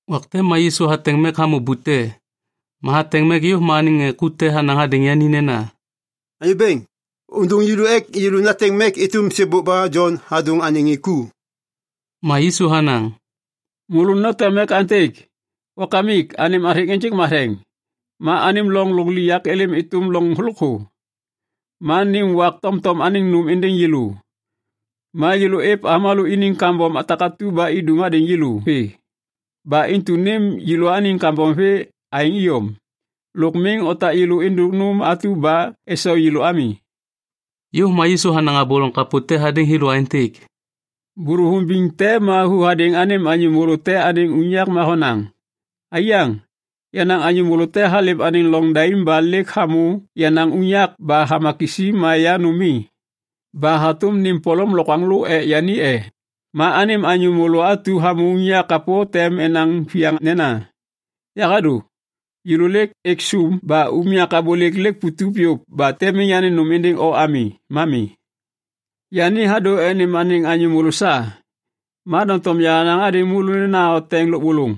Wak te ma Yisu hateŋ mek hamô bute. Ma hateŋ mek yôv ma anêŋ ŋê ku te hanaŋ hadêŋ yani nena, “Anyô Bêŋ, ôndôŋ yêlô ek yêlô nateŋ mek êtôm sêbôk ba Jon hadôŋ anêŋ ŋê ku.” Ma Yisu hanaŋ, “Môlô noteŋ mek aêntêk, “‘Wakamik, anêm athêŋ ênjêk matheŋ. Ma anêm loŋ lôkliŋyak êlêm êtôm loŋ lôkthô. Ma nêm wak tomtom anêŋ nôm êndêŋ yêlô. Ma yêlô êv avômalô iniŋ kambom takatu ba idum hadêŋ yêlô vê, ba intu nêm yêlôaniŋ kambom vê aêŋ iyom. Lôk miŋ otak yêlô êndôk nôm atu ba esau yêlô ami.’” Yôv ma Yisu hanaŋ abô loŋ kapô te hadêŋ thêlô aêntêk, “Bôlôvôŋ biŋ te ma hu hadêŋ anêm anyô môlô te anêŋ unyak ma honaŋ, ‘Aiyaŋ, yenaŋ anyô môlô te halêm anêŋ loŋ daim ba lêk hamô yenaŋ unyak ba hama kisi ma ya nôm mi. Ba hatôm nêm polom lokwaŋlô ek yani e?’ Ma anêm anyô môlô atu hamô unyak kapô tem enaŋ viyaŋ nena, ‘Yahadô. Yêlô lêk êk sôm ba unyak abôlêk lêk putup yôv ba tem miŋ yanêm nôm êndêŋ o ami ma mi.’ Yani hadô ek nêm anêŋ anyô môlô sa. Ma doŋtom yahanaŋ hadêŋ môlô nena oteŋ lôbôlôŋ,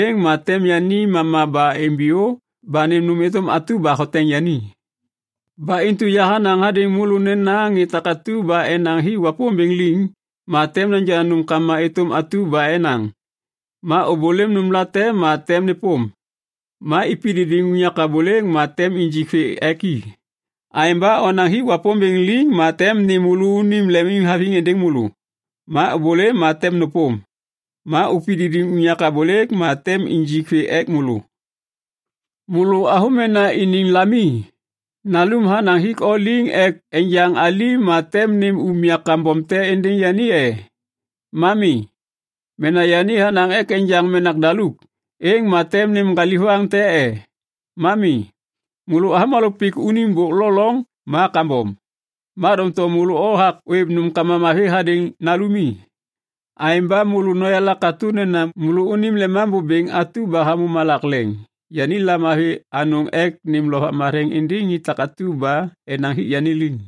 êŋ ma tem yani mama ba imbiyô ba nêm nôm êtôm atu ba hoteŋ yani. “Ba intu yahanaŋ hadêŋ môlô nena ŋê takatu ba enaŋ hik Wapômbêŋ liŋ, ma tem neja nômkama êtôm atu ba enaŋ. Ma êbôlêm nômlate ma tem nêpôm. Ma ipididiŋ unyak abôlêk ma tem injik vê ek i. Aêŋ ba onaŋ hik Wapômbêŋ liŋ ma tem nêm môlônim lemimhaviŋ êndêŋ môlô. Ma ôbôlêm ma tem nôpôm. Ma upididiŋ unyak abôlêk ma tem injik vê ek môlô. “Môlô avômena iniŋ lami, nalum hanaŋ hik o liŋ ek enjaŋ alim ma tem nêm umya kambom te êndêŋ yani e? Ma mi! Mena yani hanaŋ ek enjaŋ menak daluk, êŋ ma tem nêm ŋgalivaŋ te e? Ma mi! Môlô avômalô pik unim bôk lo loŋ ma kambom, ma doŋtom môlô othak ôêv nômkama mavi hadêŋ nalumi. Aêŋ ba môlô noyala katô nena môlônim Lemambô Bêŋ atu ba hamô malak leŋ yani lamavi anôŋ ek nêm Lovak Matheŋ êndêŋ ŋê takatu ba enaŋ hik yani liŋ.”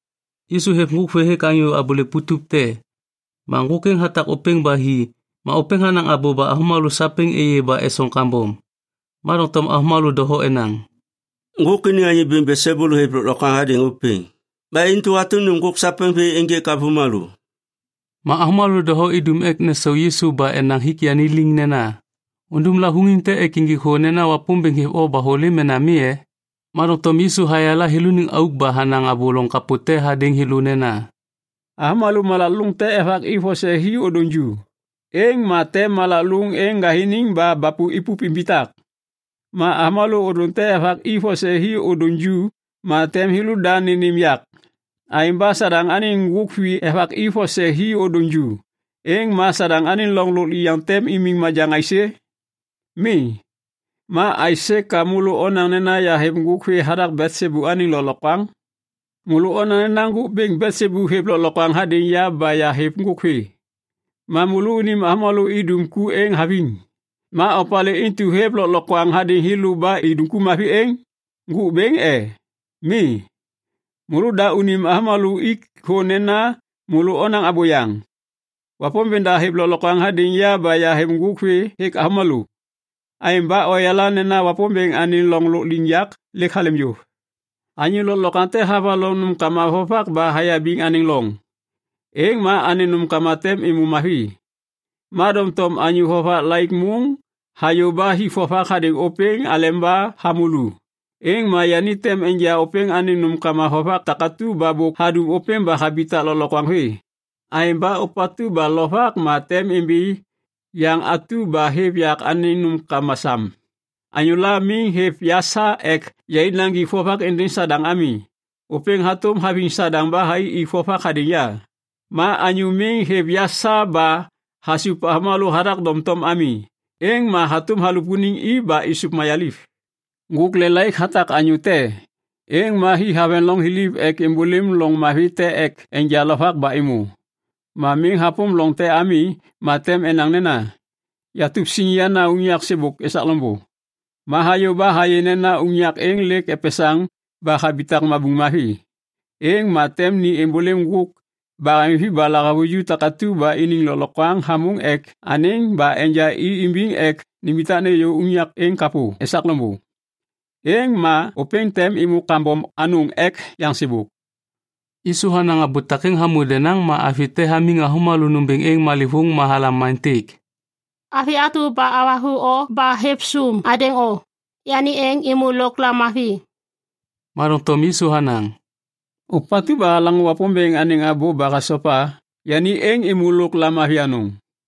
Yisu hêv ŋgôk vê hêk anyô abôlêk putup te. Ma ŋgôk êŋ hatak ôpêŋ ba hi ma ôpêŋ hanaŋ abô ba avômalô sapêŋ êyê ba esoŋ kambom. Ma doŋtom avômalô doho enaŋ, “Ŋgôk iniŋ anyô bêŋ Belsebul hêv lôklokwaŋ hadêŋ ôpêŋ. Ba intu hatôm nêm ŋgôk sapêŋ vê ênjêk avômalô.” Ma avômalô doho idum ek nesau Yisu ba enaŋ hik yani liŋ nena, “Undum lavôŋiŋ te ek injik thô nena Wapômbêŋ hêv o ba hôlêm mena mi e?” Ma doŋtom Yisu hayala thêlôniŋ auk ba hanaŋ abô loŋ kapô te hadêŋ thêlô nena, “Avômalô malak lôŋ te evaki vose hi ôdôŋ ju, êŋ ma tem malak lôŋ êŋ ŋgathiniŋ ba bapu ipup imbitak. Ma avômalô ôdôŋ te evaki vose hi ôdôŋ ju ma tem thêlôda nênêm yak. Aêŋ ba Sadaŋ anêŋ ŋgôk vi evaki vose hi ôdôŋ ju, êŋ ma Sadaŋ anêŋ loŋ lôkliŋyak tem imiŋ majaŋ aisê? Mi. Ma aisê ka môlô onaŋ nena yahêv ŋgôk vê hathak Belsebul anêŋ lôklokwaŋ? Môlô onaŋ nena ŋgôk bêŋ Belsebul hêv lôklokwaŋ hadêŋ ya ba yahêv ŋgôk vê. Ma môlônim avômalô idum ku êŋ haviŋ! Ma opalê intu hêv lôklokwaŋ hadêŋ thêlô ba idum ku mavi êŋ? Ŋgôk Bêŋ, e? Mi! Môlôda unim avômalô ik thô nena môlô onaŋ abôyaŋ. Wapômbêŋ da hêv lôklokwaŋ hadêŋ ya ba yahêv ŋgôk vê hêk avômalô. Aêŋ ba oyala nena Wapômbêŋ anêŋ loŋ lôkliŋyak lêk halêm yôv. “Anyô lôklokwaŋ te havaloŋ nômkama vovak ba hayabiŋ anêŋ loŋ, êŋ ma anêŋ nômkama tem êmô mavi. Ma doŋtom anyô vovak laik môŋ hayô ba hik vovak hadêŋ ôpêŋ aleba hamô lu, êŋ ma yani tem enja ôpêŋ anêŋ nômkama vovak takatu ba bôk hadum ôpêŋ ba habitak lôklokwaŋ vê. Aêŋ ba ôpatu ba lovak ma tem imbi yaŋ atu ba hêv yak anêŋ nômkama sam. “Anyôla miŋ hêv ya sa ek yai naŋgik vovak êndêŋ Sadaŋ ami, ôpêŋ hatôm haviŋ Sadaŋ ba thai ik vovak hadêŋ ya. Ma anyô miŋ hêv ya sa ba hasup avômalô hathak doŋtom ami, êŋ ma hatôm halupuniŋ i ba êsôv mayaliv.” “Ŋgôk lelaik hatak anyô te, êŋ ma hi haveŋ loŋ thiliv ek êmbôlêm loŋ mavi te ek enja lovak ba êmô. Ma miŋ hapôm loŋ te ami ma tem enaŋ nena, ‘Yatup siŋ yana unyak sêbôk esak loŋbô.’ Ma hayô ba hayê nena unyak êŋ lêk epesaŋ ba habitak mabuŋ mavi. Êŋ ma tem ni êmbôlêm ŋgôk baheŋvi ba lahavuju takatu ba iniŋ lôklokwaŋ hamôŋ ek anêŋ ba enja i imbiŋ ek nimbitak nêyô unyak êŋ kapô esak loŋbô. Êŋ ma ôpêŋ tem êmô kambom anôŋ ek yaŋ sêbôk.” Yisu hanaŋ abô takêŋ hamô denaŋ ma avi te hamiŋ avômalô nômbêŋ êŋ malêvôŋ ma halam aêntêk, “Avi atu ba havathu o ba hêv sum hadêŋ o, yani êŋ êmô lôk lamavi.” Ma doŋtom Yisu hanaŋ, “Ôpatu ba halaŋô Wapômbêŋ anêŋ abô ba hasopa, yani êŋ êmô lôk lamavi anôŋ.”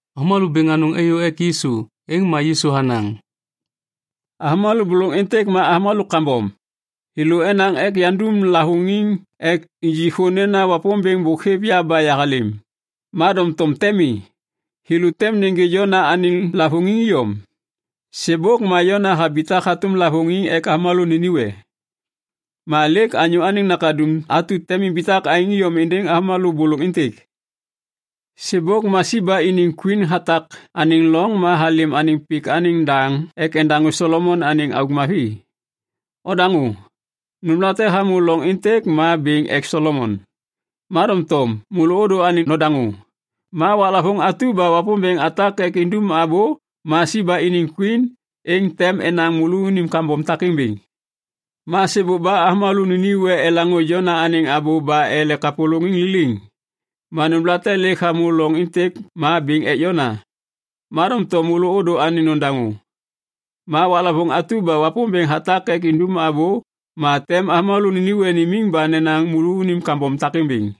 Avômalô bêŋ anôŋ êyô ek Yisu. Êŋ ma Yisu hanaŋ, “Avômalô bôlôŋ êntêk ma avômalô kambom. Thêlô enaŋ ek yandum lavôŋiŋ ek injik thô nena Wapômbêŋ bôk hêv ya ba yahalêm, ma doŋtom tem mi. Thêlô tem nêgê Jona anêŋ lavôŋiŋ iyom. Sêbôk ma Jona habitak hatôm lavôŋiŋ ek avômalô Ninive. Ma lêk Anyô Anêŋ Nakaduŋ atu tem imbitak aêŋ iyom êndêŋ avômalô bôlôŋ êntêk. “Sêbôk ma Siba iniŋ kwin hatak anêŋ loŋ ma halêm anêŋ pik anêŋ daŋ ek endaŋô Solomon anêŋ auk mavi. Odaŋô! Nômlate hamô loŋ êntêk ma bêŋ ek Solomon. Ma doŋtom môlô ôdô anêŋ nodaŋô. Ma waklavôŋ atu ba Wapômbêŋ hatak ek nindum abô ma Siba iniŋ kwin êŋ tem enaŋ môlônim kambom takêŋ bêŋ. Ma sêbôk ba avômalô Ninive elaŋô Jona anêŋ abô ba ele kapôlôŋiŋ liliŋ. Ma nômlate lêk hamô loŋ êntêk ma bêŋ ek Jona. Ma doŋtom môlô ôdô anêŋ nodaŋô. Ma waklavôŋ atu ba Wapômbêŋ hatak ek nindum abô ma tem avômalô Ninive nimiŋ ba nenaŋ môlônim kambom takêŋ bêŋ.”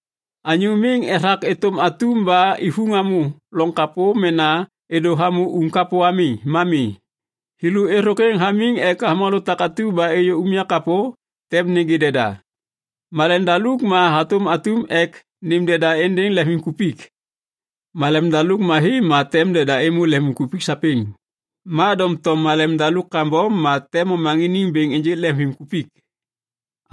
“Anyô miŋ ethak êtôm atum ba ivuŋ hamô lôŋ kapô mena êdô hamô uŋ kapô ami ma mi. Thêlô êthôkwêŋ hamiŋ ek avômalô takatu ba êyô unyak kapô tem nêgê deda. Malem daluk ma hatôm atum ek nêm deda êndêŋ lemvimkupik. Malem daluk mavi ma tem deda êmô lemvimkupik sapêŋ. Ma doŋtom malem daluk kambom ma tem momaŋiniŋ bêŋ ênjêk lemvimkupik.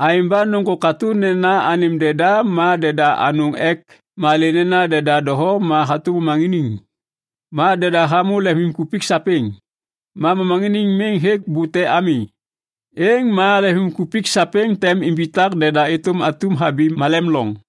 Aêŋ ba nôŋgô katô nena anêm deda ma deda anôŋ ek malê nena deda doho ma hatôm momaŋiniŋ. Ma deda hamô lemvimkupik sapêŋ, ma momaŋiniŋ miŋ hêk bute ami. Êŋ ma lemvimkupik sapêŋ tem imbitak deda êtôm atum habi malem loŋ.”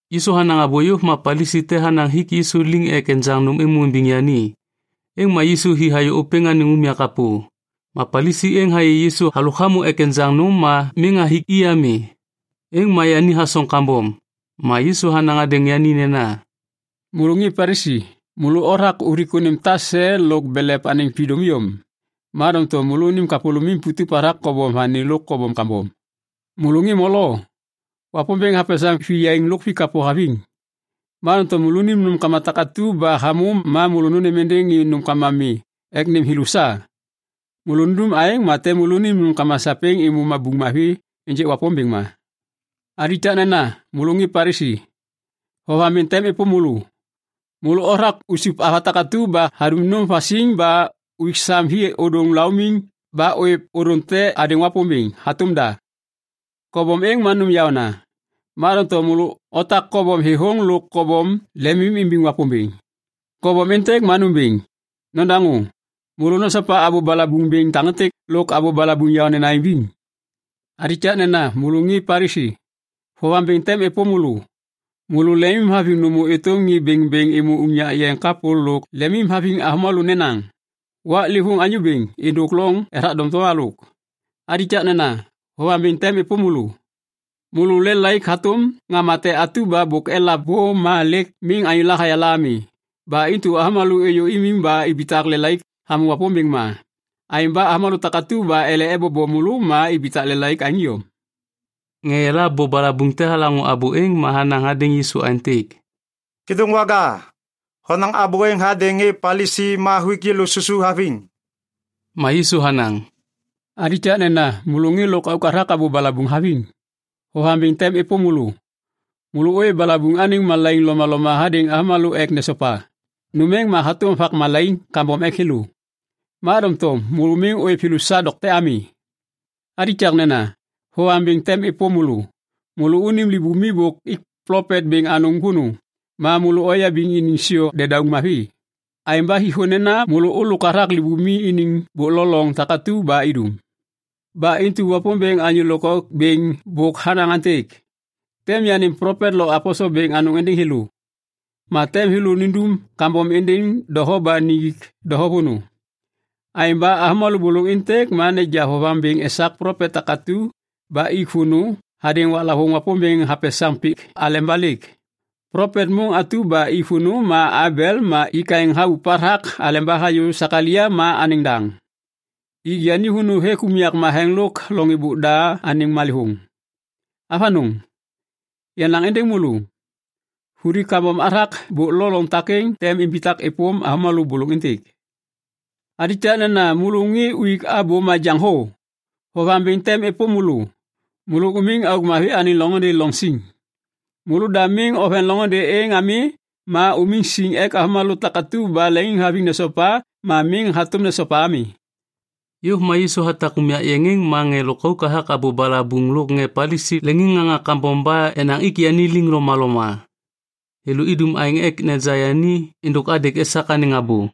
Yisu hanaŋ abô yôv ma Palisi te hanaŋ hik Yisu liŋ ek enjaŋ nôm êmô imbiŋ yani. Êŋ ma Yisu hi hayô ôpêŋ anêŋ unyak kapô. Ma Palisi êŋ hayê Yisu halôk hamô ek enjaŋ nôm ma miŋ hathik i ami. Êŋ ma yani hasoŋ kambom. Ma Yisu hanaŋ hadêŋ yani nena, “Môlô ŋê Palisi, môlô othak uthik unim tase lôk belev anêŋ vidôm iyom, ma doŋtom môlônim kapôlômim putup hathak kobom vani lo kobom kambom. Môlô ŋê molo, Wapômbêŋ hapesaŋ viyaiŋ lôk vikapô haviŋ. Ma doŋtom môlônim nômkama takatu ba hamô ma môlô nônêm êndêŋ ŋê nômkama mi ek nêm thêlô sa. Môlô nundum aêŋ ma tem môlônim nômkama sapêŋ êmô mabuŋ mavi ênjêk Wapômbêŋ ma. “Alikaknena môlô ŋê Palisi, vovaŋ bêŋ tem êpôm môlô. Môlô othak usup ava takatu ba hadum nôm vasiŋ ba uik sam hi ôdôŋ laumiŋ ba ôêv ôdôŋ te hadêŋ Wapômbêŋ hatôm da. Kobom êŋ ma nôm yaôna. Ma doŋtom môlô otak kobom thêthôŋ lôk kobom lemimimbiŋ Wapômbêŋ. Kobom êntêk ma nômbêŋ! Nodaŋô! Môlô nosopa abô balabuŋ bêŋ takêntêk lôk abô balabuŋ yaônena imbiŋ! “Alikaknena môlô ŋê Palisi, vovaŋ bêŋ tem êpôm môlô! Môlô lemimhaviŋ nômô êtôm ŋê bêŋbêŋ êmô unyak yeŋ kapô lôk lemimhaviŋ avômalô nenaŋ, ‘Waklêvôŋ anyô bêŋ’ êndôk loŋ ethak doŋtom halôk. “Alikaknena, vovaŋ bêŋ tem êpôm môlô. Môlô lelaik hatôm ŋama te atu ba bôk elav bô ma lêk miŋ anyôla hayala ami. Ba intu avômalô êyô imiŋ ba ibitak lelaik hamô Wapômbêŋ ma. Aêŋ ba avômalô takatu ba ele ebobo môlô ma ibitak lelaik aêŋ iyom.” Ŋê eyala abô balabuŋ te halaŋô abô êŋ ma hanaŋ hadêŋ Yisu aêntêk, “Kêdôŋwaga, honaŋ abô êŋ hadêŋ ŋê Palisi ma huik yêlô susu haviŋ.” Ma Yisu hanaŋ, “Alikaknena môlô ŋê lôkauk hathak abô balabuŋ haviŋ, vovaŋ bêŋ tem êpôm môlô. Môlô ôêv balabuŋ anêŋ malaiŋ lomaloma hadêŋ avômalô ek nesopa. Nôm êŋ ma hatôm vak malaiŋ kambom ek thêlô. Ma doŋtom môlô miŋ ôêv thêlô sa dokte ami. “Alikaknena, vovaŋ bêŋ tem êpôm môlô. Môlônim libumi bôk ik plopet bêŋ anôŋ vônô ma môlô oyabiŋ iniŋ siô dedauŋ mavi. Aêŋ ba hik thô nena môlô ôlôk hathak libumi iniŋ bôk lo loŋ takatu ba idum. Ba intu Wapômbêŋ anyô lôkauk bêŋ bôk hanaŋ aêntêk, ‘Tem yanêm plopet lo aposel bêŋ anôŋ êndêŋ thêlô, ma tem thêlô nindum kambom êndêŋ doho ba nijik doho vônô.’ Aêŋ ba avômalô bôlôŋ êntêk tem neja vovaŋ bêŋ esak plopet takatu ba ik vônô hadêŋ waklavôŋ Wapômbêŋ hapesaŋ pik aleba lêk. Plopet môŋ atu ba ik vônô ma Abel ma ik aêŋ habup hathak aleba hayô Sekalaia ma anêŋ daŋ. Ik yani vônô hêk unyak matheŋ lôk loŋ êbôk da anêŋ malêvôŋ. Avanôŋ, yanaŋ êndêŋ môlô, vuli kambom hathak bôk lo loŋ takêŋ tem imbitak êpôm avômalô bôlôŋ êntêk. “Alikaknena môlô ŋê uik abô majaŋ thô, vovaŋ bêŋ tem êpôm môlô! Môlô umiŋ auk mavi anêŋ loŋôndê loŋ siŋ. Môlôda miŋ oveŋ loŋôndê êŋ ami ma umiŋ siŋ ek avômalô takatu ba leŋiŋhaviŋ nesopa ma miŋ hatôm nesopa ami.” Yôv ma Yisu hatak unyak êŋ ma ŋê lôkauk hathak abô balabuŋ lôk ŋê Palisi leŋiŋŋaŋa kambom ba enaŋ ik yani liŋ lomaloma. Thêlô idum aêŋ ek neja yani êndôk adêk esak anêŋ abô.